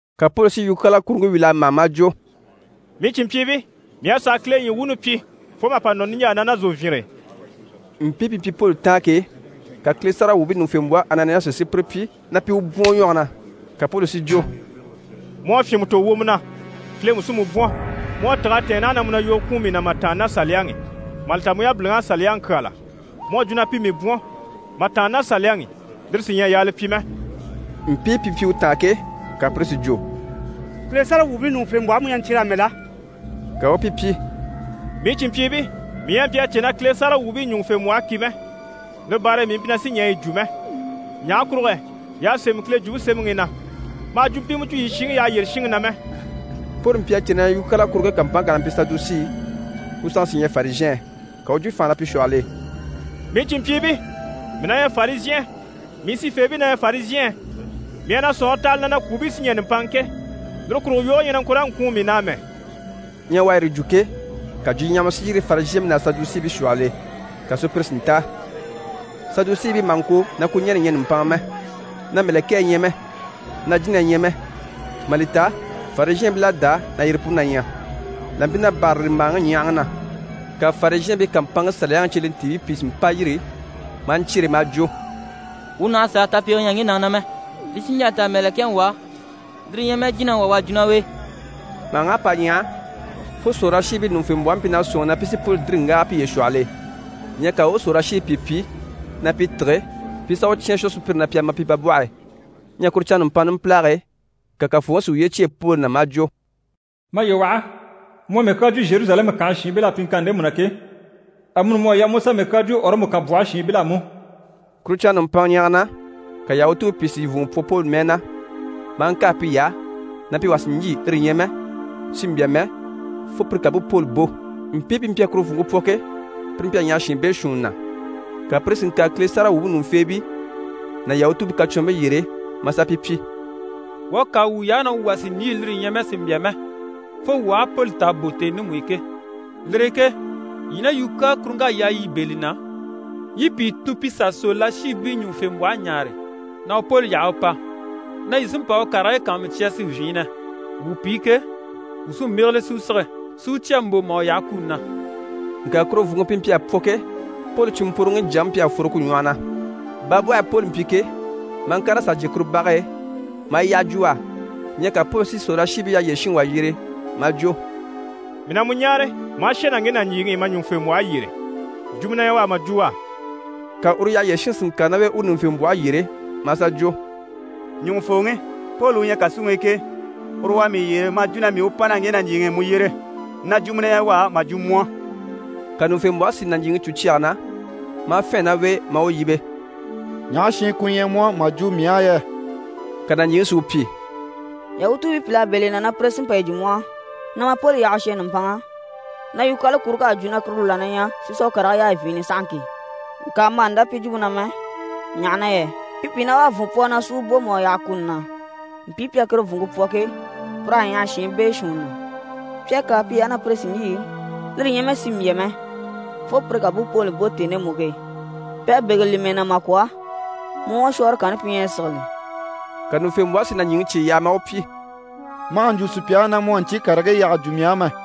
Ka Poli si yukyaala kuruŋke wíl'a mâha maa jwo: «Mii cìnmpyiibii, mii à sàa Kile ɲyii wuuni pyi fo mà pa nɔ niɲjaa na ná zòvyinre e.» Mpii pi mpyi Poli taan ke, ka Kile sáragawwuubii ɲùŋufembwɔhe Ananiyasi si pire pyi na pi u bwɔ̀n u ɲwɔge na. Ka Poli si jwo: «Mu à fyìnmɛ tò wwomɔ na, Kile mú sí mu bwɔ̀n. Mu à tîg'a tɛ̀ɛn naha na mu na yogo kwùun mii na mà tàanna ná Saliyaŋi i, mà li ta mu yabiliŋ'à Saliyaŋi kyáala. Mu à jwo na pi mii bwɔ̀n, mà tàanna ná Saliyaŋi i, lire sí ɲyɛ a yaa li pyi mɛ.» Mpii pi mpyi u taan ke, ka pire si jwo: «Kile sáragawwuubii ɲùŋufembwɔhe mu ɲyɛ na ɲcyere amɛ la?» Ka u u pi pyi: «Mii cìnmpyiibii, mii ɲyɛ a mpyi a cè na Kile sáragawwuubii ɲùŋufembwɔhe ki mɛ, lire baare e mii mpyi na sì ɲɛɛ yi jwo mɛ. Ɲaha kurugo yɛ y'à sémɛ Kile Jwumpe Semɛŋi i na “Ma hà jwumpimɛ jwo yii shiŋi yyaha yyére shinŋi na mɛ.”» Poli mpyi a cè na yukyaala kuruŋke kàmpanŋke kà na mpyi Sadusii, ku sanŋke sí ɲyɛ Farizhɛɛn, ka u u jwo fànha na pi shwɔhɔl'e: «Mii cìnmpyiibii, mii na ɲyɛ Farizhɛn, mii sifeebii na ɲyɛ Farizhɛɛn! Mii à na sɔ̀nŋɔre taha li na na kwùubii sí ɲɛ̀ nùmpanŋa ke, lire kurugo yoge ɲyɛ na ŋko raa ŋkwùun mii na amɛ!» Ɲyɛ u à yire jwo ke, ka jwuɲyahama si yîri Farizhɛɛnbii ná Sadusiibii shwɔhɔl'e, ka sùpyire si ntáa. Sadusiibii maha ŋko na kwuɲɛnɛ ɲyɛ nùmpanŋa mɛ, na mɛ̀lɛkɛɛ ɲyɛ mɛ, na jínahii ɲyɛ mɛ, mà li ta Farizhɛɛnbil'à dá na yire puni na ɲyɛ. Là mpyi na bârali màhaŋi ɲyahaŋi na, ka Farizhɛɛnbii kàmpanŋke Saliyaŋi cyelentiibii pìi si mpa yîri maa ɲcyere maa jwo: «Wuu nàha sàa tapege ɲya ŋge nàŋi na mɛ. Li sí n‑jà n‑ta mɛ̀lɛkɛŋi wà, lire ɲyɛ mɛ jínaŋi wà u à jwo ná u e.» Màhaŋ'à pa ɲyaha fo sòrolashiibii ɲùŋufembwɔhe mpyi na sɔ̂nŋi na pi sí Poli dìri n‑wáaga piye shwɔhɔl'e. Ɲyɛ ka u u sòrolashiibii pìi pyi na pi tîge, pi i sà u cyán a shwɔ sùpyire na pi a ma pi babwɔhe e. Ɲyɛ kuru canŋa nùmpanŋa numpilage e, ka Kafooŋi si uye cyêe Poli na maa jwo: «Maye waha, mu à mii kyaa jwo Zheruzalɛmu kànhe shiinbil'á pyiŋkanni ndemu na ke, amuni mu à yaa mu u sà mii kyaa jwo Ɔrɔmu kànbwɔhe shiinbil'á mú.» Kuru canŋa nùmpanŋa ɲyɛ̀ge na, ka Yahutuubii pìi si vùnŋɔ pwɔ Poli mɛɛ na, maa ŋkâa piy'á na pi wà sì n‑lyî, lire ɲyɛ mɛ sì n‑bya mɛ, fo pire ká bú Poli bò. Mpii pi mpyi a kuru vùnŋke pwɔ ke, pire mpyi a ɲyaha shiin beeshuunni na. Ka pire si ŋkàre Kile sáragawwuubii ɲùŋufeebii ná Yahutuubii kacwɔnribii yyére maa sà pi pyi: «Wuu à kâa wuy'á na wuu wà sì n‑lyî, lire ɲyɛ mɛ sì n‑bya mɛ, fo wuu aha Poli ta à bò tèni ndemu i ke. Lire e ke yii ná yukyaala kuruŋk'à yaa yii bɛ̂ li na, yii i pìi tun pi sà sòrolashiibii ɲùŋufembwɔhe ɲáare, na u Poli yaha u pa, na yii sí n‑pa u karigii kàanmucya si vyiinnɛ. Wuu pi ke, wuu sí n‑bégele si u sige, si u cya mbò mà u yaha kuni na.» Ŋka kuru vùnŋke pi mpyi a pwɔ ke, Poli cìnmpworocwoŋi jyaŋi mpyi a fworo ku ɲwɔhɔ na. Babwɔhe e Poli mpyi ke, maa ŋkàr'a sà jyè kuru bage e, maa yi yyaha jwo u á. Ɲyɛ ka Poli si sòrolashiibii yyaha yyére shinŋi wà yyere maa jwo: «Mii na mu ɲáare ma a shà ná ŋge nàɲjiiŋi i ma ɲùŋufembwɔhe yyére, jwumɔ na ɲyɛ u á mà jwo u á.» Ka uru yyaha yyére shinŋi si ŋkàre ná u e u ɲùŋufembwɔhe yyére maa sà jwo: «Ɲùŋufooŋi, Poli u ɲyɛ kàsuŋi i ke, uru u à mii yyere maa jwo na mii u pa ná ŋge nàɲjiiŋi i mu yyére, na jwumɔ na ɲyɛ u á mà jwo mu á.» Ka ɲùŋufembwɔhe si nàɲjiiŋi cû cyage na, maa fɛ̂ɛn ná u e, maa u yíbe: «Ɲaha shi ku ɲyɛ mu á mà jwo mii á yɛ?» Ka nàɲjiiŋi si u pyi: «Yahutuubii pìl'à bɛ̂ li na na pire sí n‑pa yi jwo mu á na ma Poli yaha u shà nùmpanŋa, na yukyaala kuruŋk'à jwo na kuru la na ɲyɛ si sà u karigii yaa vyiinnɛ sahaŋki. Ŋka ma hà ndá pi jwumpe na mɛ, ɲaha na yɛ pi pìi na wá a mà vùnŋɔ pwɔ u na si u bò mà u yaha kuni na. Mpii pi à kuru vùnŋke pwɔ ke, pir'à ɲyaha shiin beeshuunni na. Pi à kâa piy'á na pi sì n‑lyî, lire ɲyɛ mɛ sì n‑bya mɛ fo pire ká bú Poli bò tèni ndemu i ke. Pi à bégele li mɛɛ na mà kwɔ̀, mu ɲwɔshwɔɔre kanni pi ɲyɛ na sigili.» Ka ɲùŋufembwɔhe si nàɲjiiŋi cye yaha maa u pyi: «Ma hà ɲjwo sùpya á na mu à ɲcyii karigii yyaha jwo mii á mɛ.»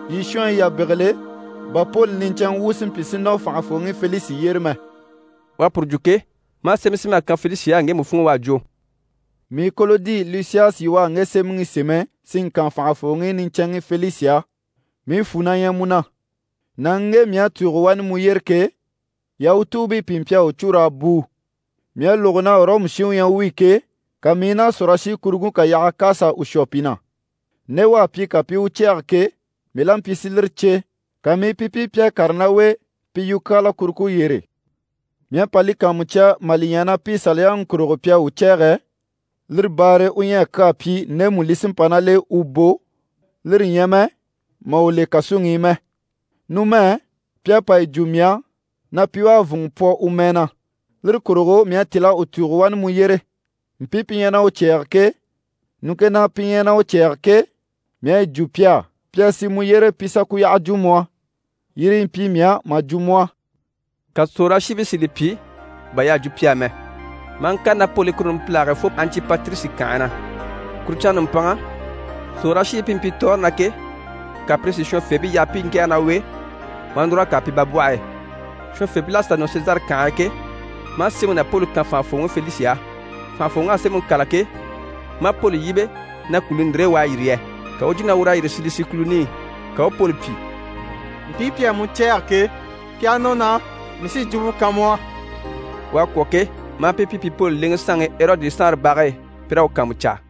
Yii shɔnyi yà bégele, bà Poli niɲcɛnŋɛ wu si mpyi si nɔ fànhafooŋi Felisi yyére mɛ.» U à puru jwo ke, maa sémɛ sém'a kan Felisi á ŋgemu funŋ'i u à jwo: «Mii Kolodi Lisiyasi u à ŋge sémɛŋi sémɛ si ŋkan fànhafooŋi niɲcɛnŋi Felisi á. Mii fwù na ɲyɛ mu na. Nàŋi u ŋge mii à tùugo wani mu yyére ke, Yahutuubii pìi mpyi a u cû raa bùu. Mii à lógo na Ɔrɔmu shin u ɲyɛ u wi ke, ka mii i na sòrolashikuruŋke kà yaha k'à sà u shwɔ pi na. Nde u à pyi ka pi i u cɛ̂ɛge ke, mii la mpyi si lire cè, ka mii i pi pyi pi à kàre ná u e pi yukyaala kuruŋke yyére. Mii à pa li kàanmucya mà li ɲya na pi Saliyaŋi kurugo pi à u cɛ̂ɛgɛ, lire baare e u ɲyɛ a kyaa pyi ndemu li sí n‑pa ná l'e u bò, lire ɲyɛ mɛ mà u le kàsuŋi i mɛ. Numɛ, pi à pa yi jwo mii á na pi wá à vùnŋɔ pwɔ u mɛɛ na. Lire kurugo mii à tíl'a u tùugo wani mu yyére. Mpii pi ɲyɛ na u cɛ̂ɛge ke, ɲùŋke na pi ɲyɛ na u cɛ̂ɛge ke, mii à yi jwo pi á, pi a sì mu yyére pi i sà ku yyaha jwo mu á. Yire yi mpyi mii á mà jwo mu á.» Ka sòrolashiibii si li pyi bà y'à jwo pi á mɛ maa ŋkàre ná Poli i kuru numpilage e fo Antipatirisi kànhe na. Kuru canŋa nùmpanŋa, sòrolashiibii pi mpyi tɔɔre na ke, ka pire si shɔnyifeebii yaha pi i ŋkɛ̀ɛge ná u e, maa núr'a kàre pi babwɔhe e. Shɔnyifeebil'à sà nɔ Sezare kànhe e ke, maa sémɛŋi ná Poli kan fànhafooŋi Felisi á. Fànhafooŋ'à sémɛŋi kâla ke, maa Poli yíbe na kùluni ndire e u à yîri yɛ. Ka u u jwo na ur'à yîri Silisi kùluni i. Ka u u Poli pyi: «Mpii pi à mu cɛ̂ɛgɛ ke, pi aha nɔ naha, mii sí jwumpe kan mu á.» U à kwɔ̀ ke, maa pi pyi pi Poli lèŋɛ saanŋi Erɔdi saanre bage e, pi raa u kàanmucaa.